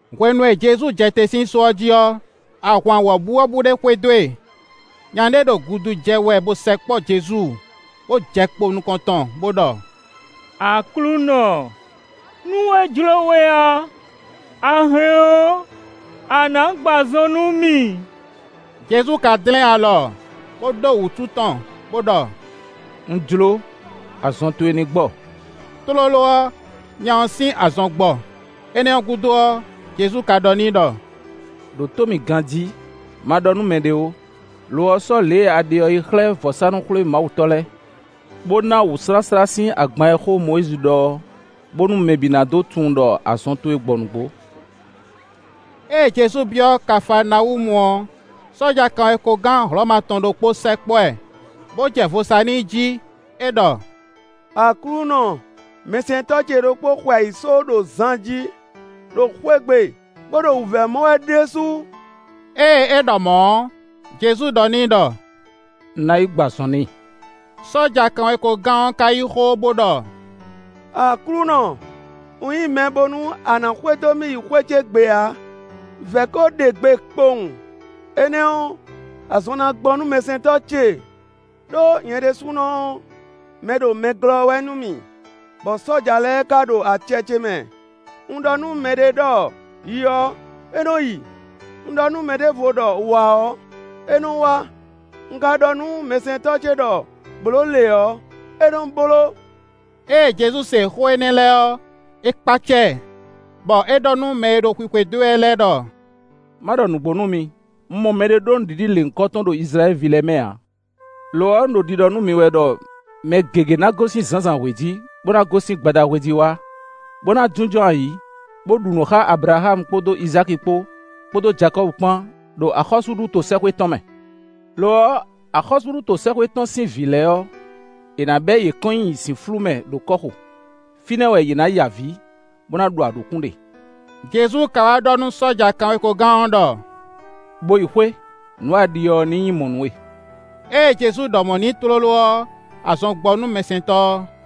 Hwenu e Jezu jɛ te sín só ɔ́ jí ɔ́, ahwan wɔ̌buwɔ́bú ɖé xwedó e. Nya ɖé ɖo gudu jɛ wɛ bó sɛkpɔ́ Jezu, bó jɛ kpo ɖo nukɔn tɔn, bo ɖɔ: “Aklúnɔ, nú é jló we ɔ́, a hɛn ɔ́, a nǎ gbɔ azɔn nú mì.” Jezu ka dlɛ́n alɔ, bó ɖó wǔtu tɔn, bó ɖɔ: “Un jló. Azɔn towe ní gbɔ.” Tlóló ɔ́, nya ɔ́ sín azɔn gbɔ. Énɛ́ ɔ́ gúdo ɔ́, Jezu ka ɖɔ n'i ɖɔ: “Ɖǒ tó mì ganjí; ma ɖɔ nú mɛɖé ó; lo ɔ́, sɔ́ lě e a ɖe ɔ́ yi xlɛ́ vɔ̌sánú-xwlémawutɔ́ lɛ́ɛ, bó ná wǔsláslá sín agban e xó Mɔyízi ɖɔ ɔ́, bónú mɛ bǐ ná dó tunwun ɖɔ azɔn towe gbɔ nǔgbó.” Ée Jezu byɔ́ Kafaanawúmu ɔ́, sɔ́ja kanwekogán Hlɔ̌ma tɔn ɖokpó sɛkpɔ́ ɛ, bó jɛ vo sa n'i jí; é ɖɔ: “Aklúnɔ, mɛsɛntɔ́ ce ɖokpó xwe ayǐsó ɖo zan jí ɖo xwé gbe, bó ɖo wǔvɛ́ mɔ wɛ ɖésú.” Ée é ɖɔ mɔ̌ ɔ́, Jezu ɖɔ n'i ɖɔ: “Un ná yi gbɔ azɔn n'i.” Sɔ́ja kanwekogán ɔ́ ka yí xó bó ɖɔ: “Aklúnɔ, un nyí mɛ bónú a nǎ xwedó mì yi xwé cé gbe ǎ. Vɛ̌ ko ɖe gbe kpowun, énɛ́ ɔ́, azɔn ná gbɔ nú mɛsɛntɔ́ ce. Ɖó nyɛ ɖésúnɔ ɔ́, mɛɖomɛglɔ́ wɛ nú mì, bɔ sɔ́ja lɛ́ɛ ka ɖo acɛ ce mɛ. Un ɖɔ nú mɛ ɖě ɖɔ: ‘Yi’ ɔ́, é nɔ yi; un ɖɔ nú mɛ ɖěvo ɖɔ: ‘Wǎ’ ɔ́, é nɔ wá; un ka ɖɔ nú mɛsɛntɔ́ ce ɖɔ: ‘Blǒ lě’ ɔ́, é nɔ bló.” Ée Jezu se xó énɛ́ lɛ́ɛ ɔ́, é kpácá ɛ, bɔ é ɖɔ nú mɛ e ɖo xwixwedó e wɛ lɛ́ɛ ɖɔ: “Má ɖɔ nǔgbó nú mi; un mɔ mɛɖé ɖó nǔɖiɖi lěhunkɔtɔn ɖo Izlayɛ́li ví lɛ́ɛ mɛ ǎ. Lo ɔ́, un ɖo ɖiɖɔ nú mi wɛ ɖɔ mɛ gěgé ná gosín zǎnzǎnhwe jí, bó ná gosín gbadahwe jí wá, bó ná jínjɔ́n ayǐ, bó ɖu nǔ xá Ablaxámu kpódó Izáki kpó, kpódó Jakɔ́bu kpán, ɖo axɔ́súɖuto sɛ́xwé tɔn mɛ. Lo ɔ́, axɔ́súɖuto sɛ́xwé tɔn sín vǐ lɛ́ɛ ɔ́, è nǎ bɛ̌ yě kɔn nyi zǐnflú mɛ ɖo kɔ́xo. Fínɛ́ wɛ yě ná ya avǐ, bó ná ɖu aɖǔkún ɖe.” Jezu ka wá ɖɔ nú sɔ́ja kanwekogán ɔ́ ɖɔ: “Bo yi xwé, nǔ e a ɖi ɔ́ ní nyí mɔ̌ nú we.” Ée Jezu ɖɔ mɔ̌ n'i tlóló ɔ́, azɔn gbɔ nú mɛsɛntɔ́ ɔ́.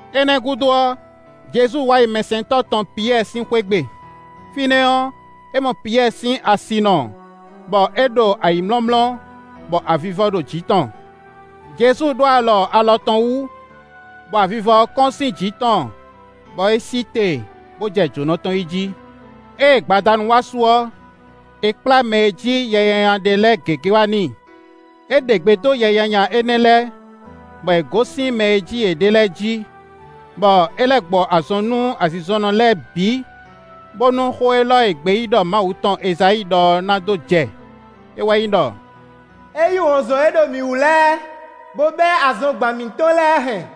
Énɛ́ gúdo ɔ́, Jezu wá yi mɛsɛntɔ́ tɔn Piyɛ́ɛ sín xwé gbe. Fínɛ́ ɔ́, é mɔ Piyɛ́ɛ sín asinɔ bɔ é ɖo ayǐmlɔ́mlɔ́, bɔ avivɔ ɖo jǐ tɔn. Jezu ɖó alɔ alɔ tɔn wú, bɔ avivɔ ɔ́ kɔ́n sín jǐ tɔn, bɔ é sí te, bó jɛ jǒnɔ tɔn yí jí. Ée gbadanu wá su ɔ́, è kplá mɛ e jí yɛ nyanya ɖe lɛ́ɛ gěgé wá n'i. É ɖe gbe dó yɛ nyanya énɛ́ lɛ́ɛ, bɔ yě gosín mɛ e jí yě ɖe lɛ́ɛ jí, bɔ é lɛ́ gbɔ azɔn nú azinzɔnnɔ lɛ́ɛ bǐ, bónú xó élɔ́ e gbeyíɖɔ Mawu tɔn Ezayíi ɖɔ ɔ́ na dó jɛ; é wɛ nyí ɖɔ: “É yí wɔ̌nzɔn e ɖo mǐ wú lɛ́ɛ, bó bɛ́ azɔngban mǐtɔn lɛ́ɛ hɛn.”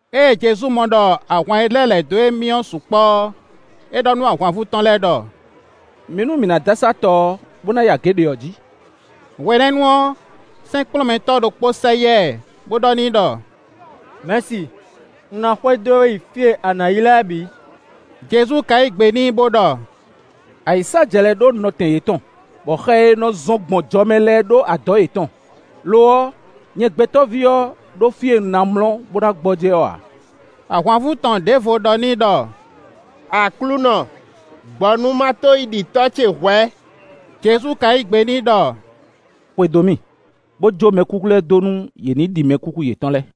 Ée Jezu mɔ ɖɔ ahwan e lɛ́ lɛ̌ dó émí ɔ́ sukpɔ́ ɔ́, é ɖɔ nú ahwanvú tɔn lɛ́ɛ ɖɔ: “Mi nú mǐ ná dó asá tɔ ɔ́, bó ná yi agě ɖě ɔ́ jí.” Hwenɛ́nu ɔ́, sɛ́nkplɔ́nmɛtɔ́ ɖokpó sɛ yá ɛ, bó ɖɔ n'i ɖɔ: “Mɛ̌si, un ná xwedó we yi fí e a nǎ yi lɛ́ɛ bǐ.” Jezu ka yí gbe n'i bó ɖɔ: “Ayǐsájɛ lɛ́ɛ ɖó nɔtɛn yětɔn, bɔ xɛ e nɔ zɔ́n gbɔn jɔmɛ lɛ́ɛ ɖó adɔ̌ yětɔn. Lo ɔ́, nyɛ Gbɛtɔ́ví ɔ́ ɖó fí e un ná mlɔ́, bó ná gbɔjɛ́ ɔ́ ǎ.” Ahwanvú tɔn ɖěvo ɖɔ n'i ɖɔ: “Aklúnɔ, gbɔ nú ma to yi ɖi tɔ́ ce hwɛ̌.” Jezu ka yí gbe n'i ɖɔ: “Xwedó mì, bo jó mɛkúkú lɛ́ɛ dó nú yě ní ɖi mɛkúkú yětɔn lɛ́ɛ.”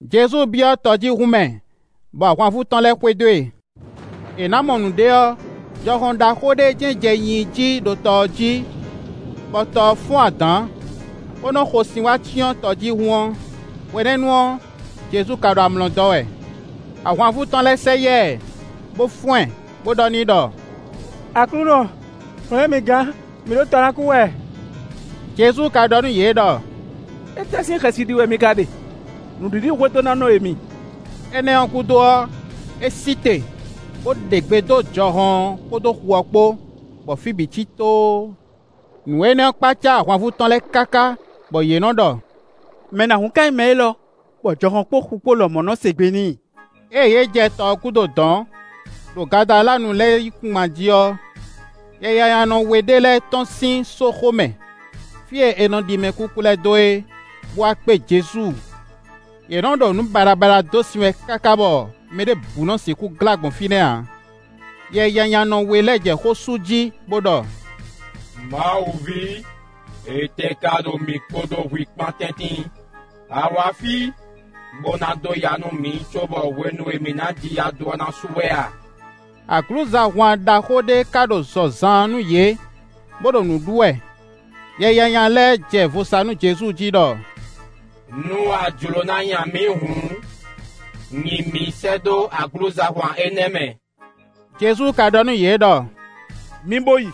Jezu byɔ́ tɔjíhún mɛ, bɔ ahwanvú tɔn lɛ́ɛ xwedó e. È nǎ mɔ nǔɖé ɔ́, jɔhɔn ɖaxó ɖé jɛ́n jɛ nyinyi jí ɖo tɔ ɔ́ jí, bɔ tɔ ɔ́ fɔ́n adǎn, bó nɔ́ xo sin wá cyɔ́n tɔjíhún ɔ́. Hwenɛ́nu ɔ́, Jezu ka ɖo amlɔ dɔ́ wɛ. Ahwanvú tɔn lɛ́ɛ sɛ yá ɛ, bo fɔ́n ɛ, bo ɖɔ n'i ɖɔ: “Aklúnɔ, hwlɛ̌n mǐ gán; mǐ ɖo tɔ ná kú wɛ.” Jezu ka ɖɔ nú yě ɖɔ: “Étɛ́ sín xɛsi ɖi wɛ mi ka ɖe? Nǔɖiɖihwedónánɔ e mi!” Énɛ́ ɔ́ gúdo ɔ́, é sí te, bó ɖe gbe dó jɔhɔn ɔ́ kpódó xu ɔ́ kpó, bɔ fí bǐ cí tóó. Nǔ énɛ́ ɔ́ kpácá ahwanvú tɔn lɛ́ɛ káká, bɔ yě nɔ ɖɔ: “Mɛ nǎhún ká nyí mɛ élɔ́, bɔ jɔhɔn kpódó xu kpó lɔmɔ̌ nɔ se gbe n'i?” Ée yě jɛ tɔ ɔ́ gúdo dɔ̌n, ɖo Gadaláanu lɛ́ɛ yíkúngban jí ɔ́, yɛnyanyanɔ we ɖé lɛ́ɛ tɔ́n sín sóxo mɛ, fí e è nɔ ɖi mɛkúkú lɛ́ɛ dó é, bó wá kpé Jezu. Yě nɔ́ ɖo nǔ baɖabaɖa dó sin wɛ káká bɔ mɛ ɖěbǔ nɔ́ sixú glá gbɔn fínɛ́ ǎ. Yɛnyanyanɔ we lɛ́ɛ jɛ xó sú jí, bó ɖɔ: “Mawu ví! Étɛ́ ká ɖo mǐ kpódó hwi kpán tɛ́ntin? A wǎ fí, bó ná dó ya nú mǐ cóbɔ hwenu e mǐ ná ji ya dó ɔ́ ná su wɛ a?” Aglǔzahwan ɖaxó ɖé ka ɖo zɔ zaan nú yě, bo ɖo nǔ ɖu wɛ. Yɛ nyanya lɛ́ɛ jɛ vo sa nú Jezu jí ɖɔ: “Nú a jló ná nya mǐ hǔn, nyi mǐ sɛ́ dó aglǔzahwan énɛ́ mɛ.” Jezu ka ɖɔ nú yě ɖɔ: “Mi bo yi;”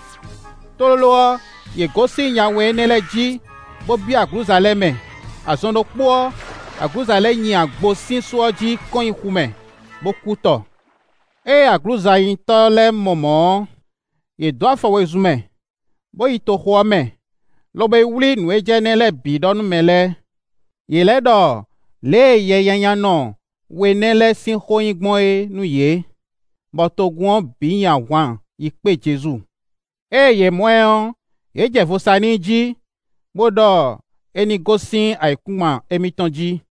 tlóló ɔ́, yě gosín nya we nɛ́ lɛ́ɛ jí, bó byɔ́ aglǔza lɛ́ɛ mɛ. Azɔn ɖokpó ɔ́, aglǔza lɛ́ɛ nyi agbo sín só ɔ́ jí kɔn nyi xu mɛ, bó kú tɔ. Ée aglǔzanyitɔ́ lɛ́ɛ mɔ mɔ̌ ɔ́, yě dó afɔ wezun mɛ, bó yi toxo ɔ́ mɛ, lobo yi wlí nǔ e jɛ énɛ́ lɛ́ɛ bǐ ɖɔ nú mɛ lɛ́ɛ. Yě lɛ́ ɖɔ lě e yɛnyanyanɔ we nɛ́ lɛ́ɛ sín xó yi gbɔn é nú yě, bɔ togun ɔ́ bǐ nyi ahwan yi kpé Jezu. Ée yě mɔ ɛ ɔ́, yě jɛ vo sa n'i jí, bó ɖɔ é ní gosín ayǐkúngban émítɔn jí.